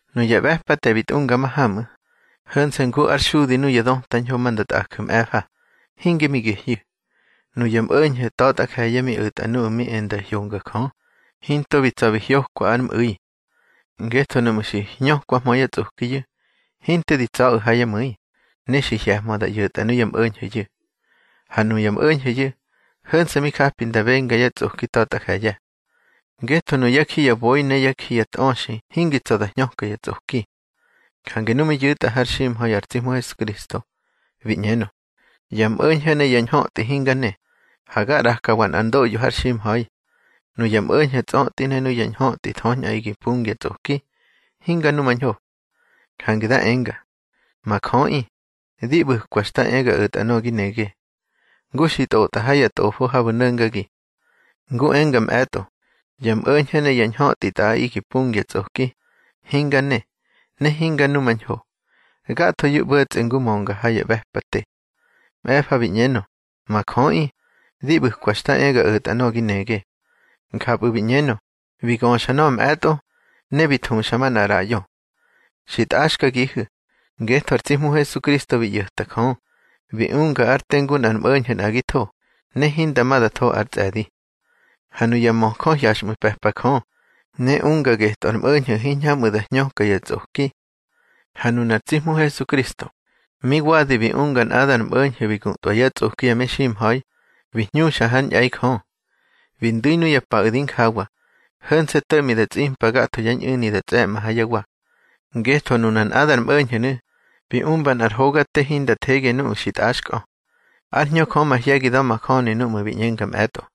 Nuya ꞌbe̱pate bi tꞌunga mahamꞌu̱, ho̱nse̱ ngu ár xudi nuya döta ñho ma nda tꞌaju̱ mꞌe̱fa, hinge mi gehyu̱. Nuya mꞌo̱ñho̱ ta̱tꞌa je̱ye̱ mi o̱tꞌa nuꞌu̱ mi e nda hyonga Jö, hinto bi tsa̱ bi hyokwa ár mꞌu̱i. Ngetho nuꞌmu̱ xi hñökwahmö yá tsꞌokiyu̱, hinte di tsa̱ꞌu̱ ha yá mu̱i, ne xi hye̱hmö da ꞌyo̱tꞌa nuya mꞌo̱ñho̱yu̱. Ha nuya mꞌo̱ñho̱yu̱, ho̱nse̱ mi japi da benga yá tsꞌoki ta̱tꞌa je̱ye̱. Ngetho nuyá ji ya boi ne yá ji ya tꞌöxi hingi tsa̱ da hñöka ya tsꞌoki. Jange nu mi yu̱tꞌa har ximha̱i ar tsi Hmu Hesukristo, bi ꞌñenö: Ya mꞌo̱ñho̱ ne ya ñhötꞌi hinga ne, ha ga ꞌrakawa nꞌar ndoꞌyo har ximha̱i. Nuya mꞌo̱ñho̱ tsꞌötꞌi ne nuya ñhötꞌi thöñꞌaꞌi gi pungya tsꞌoki, hinga numañho. Jange da enga: Ma Jöꞌi, di ꞌbu̱kwa xta e ga o̱tꞌa nöꞌö gi nege, ngu xi ntꞌotꞌa ha ya tꞌofo habu̱ no̱ngagi. Ngu enga mꞌe̱tꞌo: Ya mꞌo̱ñho̱ ne ya ñhötꞌi tꞌaꞌi gi pungya tsꞌoki, hinga ne, ne hinga numañho. (Gathoyu̱ ꞌbo̱tsꞌe ngu mönga ha ya ꞌbe̱pate.) Mꞌe̱fa bi ꞌñenö: Ma Jöꞌi, di ꞌbu̱kwa xta e ga o̱tꞌa nöꞌö gi nege. Njapꞌu̱ bi ꞌñenö, bi göxa nöꞌö mꞌe̱tꞌo, ne bi thuxa manꞌa ꞌraꞌyo. Xi tꞌaxkagihu̱, ngetho ar tsi Hmu Hesukristo bi ꞌyo̱ta Jö, bi unga ár te ngu nꞌar mꞌo̱ñho̱ nꞌagitho, ne hinda ma da tho ár tsꞌe̱di. Ha nuya möjö hyaxꞌmu̱ pe̱pa Jö, ne unga getꞌö ar mꞌo̱ñho̱ hiñhamꞌu̱ da hñöka ya tsꞌoki. Ha nunar tsi Hmu Hesukristo, mi wadi bi unga nꞌadar mꞌo̱ñho̱ bi gutꞌwa yá tsꞌoki ya meximha̱i, bi hñuxa hár ñꞌe̱i Jö. Bi ndu̱ nuya paꞌu̱ di njawa, ho̱nse̱ to̱ꞌmi da tsꞌimpa gatho yá ñꞌu̱ni da tsꞌe̱mꞌa ha yá wa. Ngetho nuna nꞌadar mꞌo̱ñho̱nu̱, bi umba nꞌar hoga te hinda thege nuꞌu̱ xi tꞌaxkꞌö. Ár Hñö Jö mahye̱gi da̱majöni núꞌmu̱ bi ꞌñenga mꞌe̱tꞌo: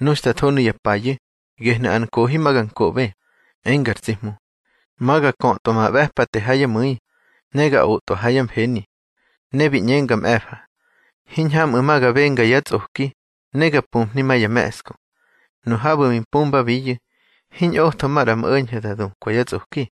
Nu xta tho nuya payu̱, gehnu̱ ar nkohi ma ga nkoꞌbe, enga ar tsi Hmu: Ma ga kötꞌwa ma ꞌbe̱pate ha yá mu̱i, ne ga otꞌwa ha yá mfeni. Ne bi ꞌñenga mꞌe̱fa: Hiñhamꞌu̱ ma ga benga yá tsꞌoki, ne ga puhni ma ya me̱ꞌsku. Nu habu̱ xi mpumbabiyu̱, hiñꞌotho maꞌra ya mꞌo̱ñho̱ da dukwa yá tsꞌoki.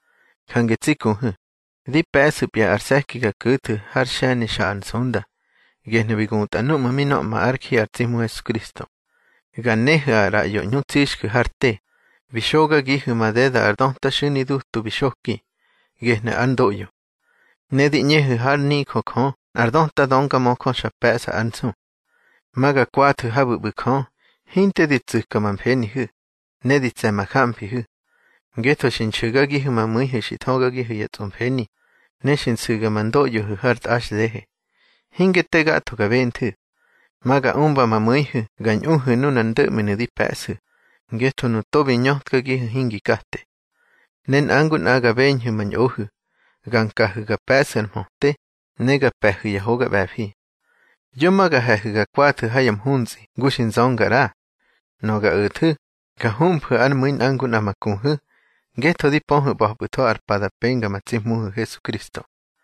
Jange tsi kuhu̱, di pe̱ꞌsu̱pya ar se̱ki ga ku̱thu̱ har xe̱ni Xa Ar Nsunda, gehnu̱ bi gutꞌa núꞌmu̱ mi nöꞌma ár ji ar tsi Hmu Hesukristo. Ga nehu̱ ar ꞌraꞌyo ꞌñu tsixju̱ har te, bi xogagihu̱ madeda ar döta xu̱ni dutu bi xoki, gehnu̱ ár ndoꞌyo. Ne di ꞌñehu̱ hár nijö Jö nꞌar döta döngamöjö xa pe̱ꞌsa ár nsu. Ma ga kwathu̱ habu̱ ꞌbu̱ Jö, hinte di tsu̱ka ma mfenihu̱, ne di tse̱ ma jamfihu̱. Ngetho xi nxu̱gagihu̱ ma mu̱ihu̱ xi thögagihu̱ ya tsꞌomfeni, ne xi nsu̱ga ma ndoꞌyohu̱ har tꞌaxdehe. Hinge te gatho ga benthu̱. Ma ga umba ma mu̱ihu̱ ga ñꞌuhu̱ nunar ndo̱ꞌminu̱ di pe̱ꞌsu̱, ngetho nu togo bi ñötkagihu̱ hingi kate. Ne nꞌa ngu nꞌa ga beñhu̱ ma ñꞌohu̱, ga nkahu̱ ga pe̱ꞌsu̱ ar mhöte, ne ga pe̱hu̱ ya hoga ꞌbe̱fi. Yo ma ga he̱hu̱ ga kwathu̱ ha ya mhuntsꞌi ngu xi nzönga ꞌra. Nöꞌö ga o̱thu̱, ga humfu̱ ár mu̱i nꞌa ngu nꞌa ma kuhu̱, ngetho di pöhu̱ ꞌba̱pꞌu̱tho ar pa da penga ma tsi Hmuhu̱ Hesukristo.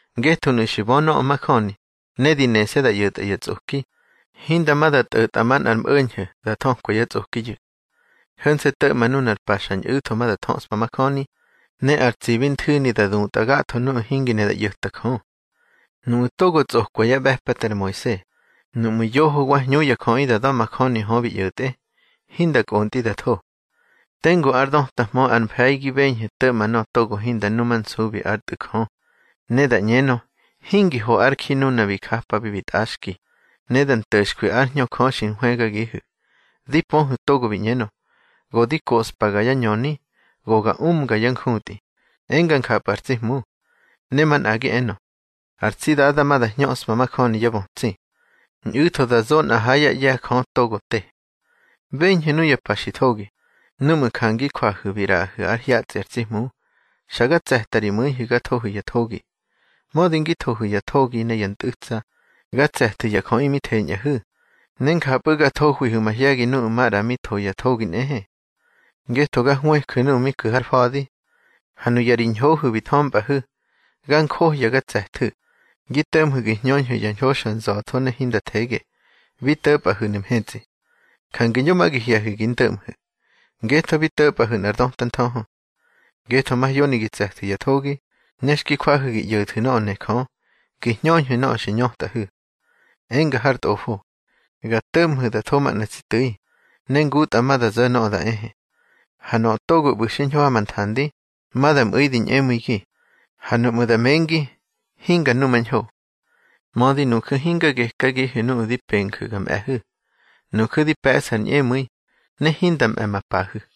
Ngetho nuꞌu̱ xi bö nöꞌö majöni, ne di nese̱ da ꞌyo̱tꞌa ya tsꞌoki, hinda ma da tꞌo̱tꞌa manꞌar mꞌo̱ñho̱ da thökwa yá tsꞌokiyu̱. Ho̱nse̱ to̱ꞌma nunar pa xa ñꞌu̱tho da thöꞌspa majöni, ne ar tsibi nthu̱ni da dutꞌa gatho nuꞌu̱ hingi ne da ꞌyo̱ta Jö. Nuꞌu̱ togo tsꞌokwa yá ꞌbe̱pate ar Moise, nuꞌmu̱ yoho wa hñu ya jöꞌi da da̱majöni hö bi ꞌyo̱tꞌe, hinda kꞌontꞌi da tho. Tengu ár dötahmö ar mfe̱i gi beñhu̱ to̱ꞌma nöꞌö togo hinda numansubi ár Tꞌu̱ Jö, ne da ꞌñenö, hingi ho ár ji nuna bi japabi bi tꞌaxki, ne da nto̱xkwi ár Hñö Jö xi nhwëgagihu̱. Di pöhu̱ togo bi ꞌñenö: Go di koꞌspaga yá ñöni, go ga umga yá njutꞌi, enga njapꞌu̱ ar tsi Hmu. Ne manꞌagi enö: Ar tsi Dada ma da hñöꞌspa majöni yá bötsi. Ñꞌu̱tho da zo nꞌa ha yá ꞌye̱ Jö togo te. Beñhu̱ nuya pa xi thogi, núꞌmu̱ ja ngi jwahu̱ bi ꞌraꞌahu̱ ár hyatsꞌi ar tsi Hmu, xa ga tse̱ta ri mu̱ihu̱ ga thohu̱ ya thogi. Mödi ngi thohu̱ ya thogi ne ya ntꞌu̱tsa, ga tse̱thu̱ ya jöꞌi mi theñꞌahu̱, ne njapꞌu̱ ga thohwihu̱ mahye̱gi nuꞌu̱ maꞌra mi tho ya thogi nꞌehe. Ngetho ga hwëju̱ nuꞌu̱ mi ku̱ har fa̱di. Ha nuya ri ñhohu̱ bi thömpꞌahu̱, ga njohya ga tse̱thu̱, gi to̱ꞌmhu̱ gi hñöñhu̱ ya ñho xa nza̱tho ne hinda thege, bi to̱pꞌahu̱nu̱ mhetsꞌi. Jange yo ma gi hye̱hu̱ gi ndöꞌmhu̱, ngetho bi to̱pꞌahu̱ nꞌar döta nthöhö. Ngetho mahyoni gi tse̱thu̱ ya thogi, ne xki jwahu̱ gi ꞌyo̱thu̱ nöꞌö ne Jö, gi hñöñhu̱ nöꞌö xi ñötꞌahu̱. Enga har Tꞌofo: Ga to̱ꞌmhu̱ da tho manꞌa tsi tu̱i, ne ngutꞌa ma da zo̱ nöꞌö da ehe. Ha nöꞌö togo ꞌbu̱ xiñho ha ma nthandi, ma da mꞌu̱i di ñꞌemu̱igi, ha nuꞌmu̱ da mengi, hinga numañho. Mödi nuju̱ hinga gekagihu̱ nuꞌu̱ di penju̱ ga mꞌe̱hu̱. Nuju̱ di pe̱ꞌsu̱ ar ñꞌemu̱i, ne hinda mꞌe̱ ma pahu̱.